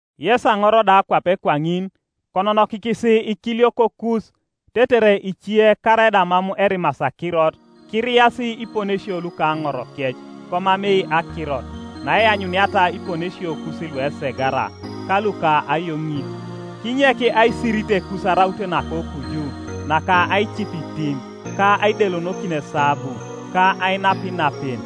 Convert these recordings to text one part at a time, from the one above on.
Yes aŋor da kwape kwaŋin, kononokikis ikiliokokus, tetere ice, karaida mam erimasi akirot, kiriasi iponesio luka aŋorokec komamei akirot, naeanyuniata iponesiokus luesegara, ka luka ayoŋit. Kinyek aisiritekus araut nakokuju, naka aicip itim, ka aidelonokin esabu, ka ainap inapen,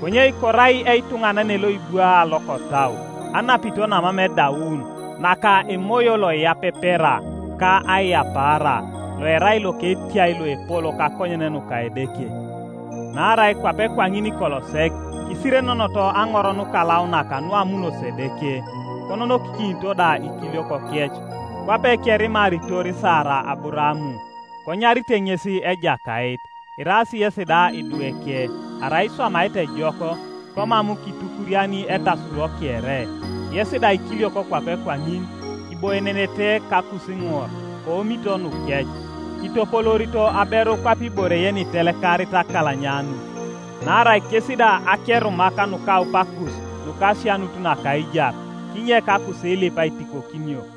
konye korai etuŋanane loibwaa lokotau, anapito namam edaun naka emoyo loiyapepera ka aiyapaara, loerai loketiai loepol kakonyen nuka Edeke. Naarai kwape kwaŋin kolo sek kisirenenoto aŋor nukalaunak nuamunosi Edeke, kononokikinito da ikiliokokec. Kwape kerimaritor Sara Aburaam, konyarite ŋes ejakait. Iraas yesi da idweke, arai iswamaete ejok, komam kitukuriani etasuro kere. Yes da ikiliok kwape kwaŋin, kiboienenete kakusiŋor koomito nukec, kitopoloorito aberu kwape ibore yenitelekarit akalanyanut, naarai kes da akerumak nukaupakus nuka asianut naka aijar, kinyek akusiilip aitikokinio.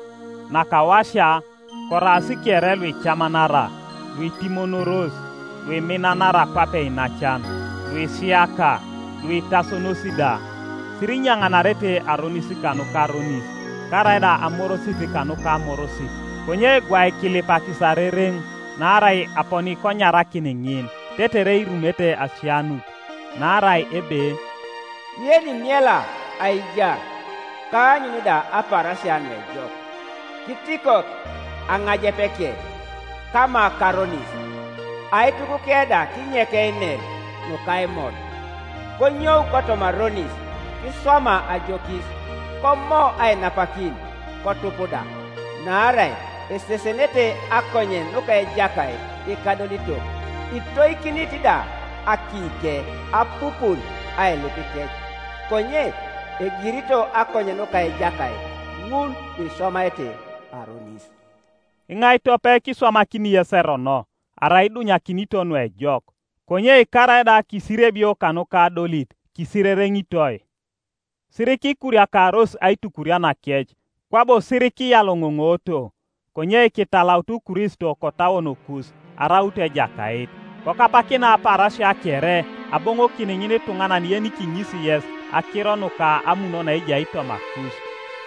Nakawasia, koraas kere luicamanara, luitimonoros, luiminanara kwape iinacan, luisiaka, luitasonos da. Sirinyaŋarete aronis kanuka aronis, karaida amorosit kanuka amorosit; konye gwai kilipakis arereŋ, naarai aponi konyarakin ŋin, tetere irumete asianut. Naarai ebe: “Yenimiela aijar, ka aanyun da apaarasia nuejok, Kitikok aŋajepeke kama karonis, Aitukuke da kinyek einer nukaimod. Konyou kotoma aronis, kiswama ajokis; Komo ainapakin, kotup da. Naarai esesenete akonyen nuka Ejakait ikadolitok, Itoikinit da akiike apupun ailipikec. Konye egirito akonyen nuka Ejakait ŋul luiswamaete aronis.” Iŋai tope kiswamakini yes erono arai idunyakinito nuejok? Konye karaida kisiriebio kanuka adolit kisirereŋitoi, Sirikikuriakaros aitukurianakec, kwabo sirikiyaloŋoŋoto, konye kitalautu Kristo kotauonokus araut Ejakait. Kokapakina apaarasia kere aboŋokin ŋinituŋanan yenikiŋisi yes akiro nuka amun naejai tomakus,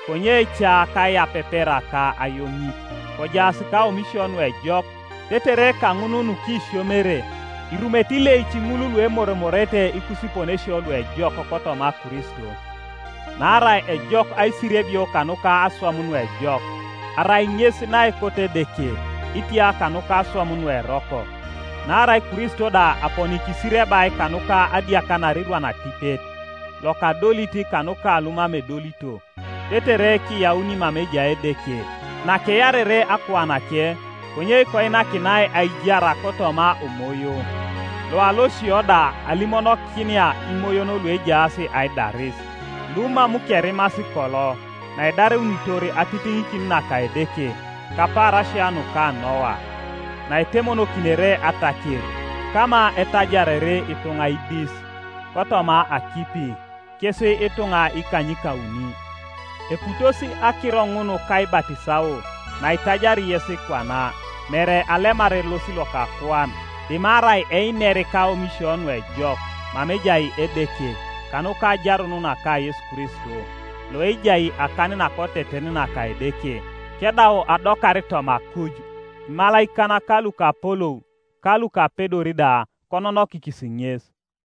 konye ca kaiyapepera ka ayoŋit. Kojaas kaomisio nuejok, tetere kaŋun nukisiomere, irumete ileic ŋul luemoromoroete ikusiponesio luejok kotoma Kristo. Naarai ejok aisiriebio kanuka aswam nuejok, arai ŋes naekot Edeke, itia kanuka aswam nueroko. Naarai Kristo da aponi kisiriebai kanuka adiakanar irwan atipet, lokadolit kanuka lumam edolito, tetere kiyauni mama ejai Edeke, nakearere akuanake, konye koinakinai aijar kotoma omoyo, loalosio da alimonokinia imoyon luejaas aidaris, lumam kerimasi kolo, naedareunitor atitiŋikin naka Edeke, kapaarasia nuka Noa, naetemonokinere ataker, kama etajarere ituŋa idis, kotoma akipi, kes ituŋa ikanykauni. Eputosi akiro ŋun kaibatisao, naitajari yes kwana, mere alemar elos loka akuan, dimarai einer kaomisio nuejok mama ejai Edeke, kanuka ajarun naka Yesu Kristo, ejai akan nakoteten naka Edeke, kedau adokar toma akuj; imalaikan, ka lukapolou, ka lukapedor da kononokikis ŋes.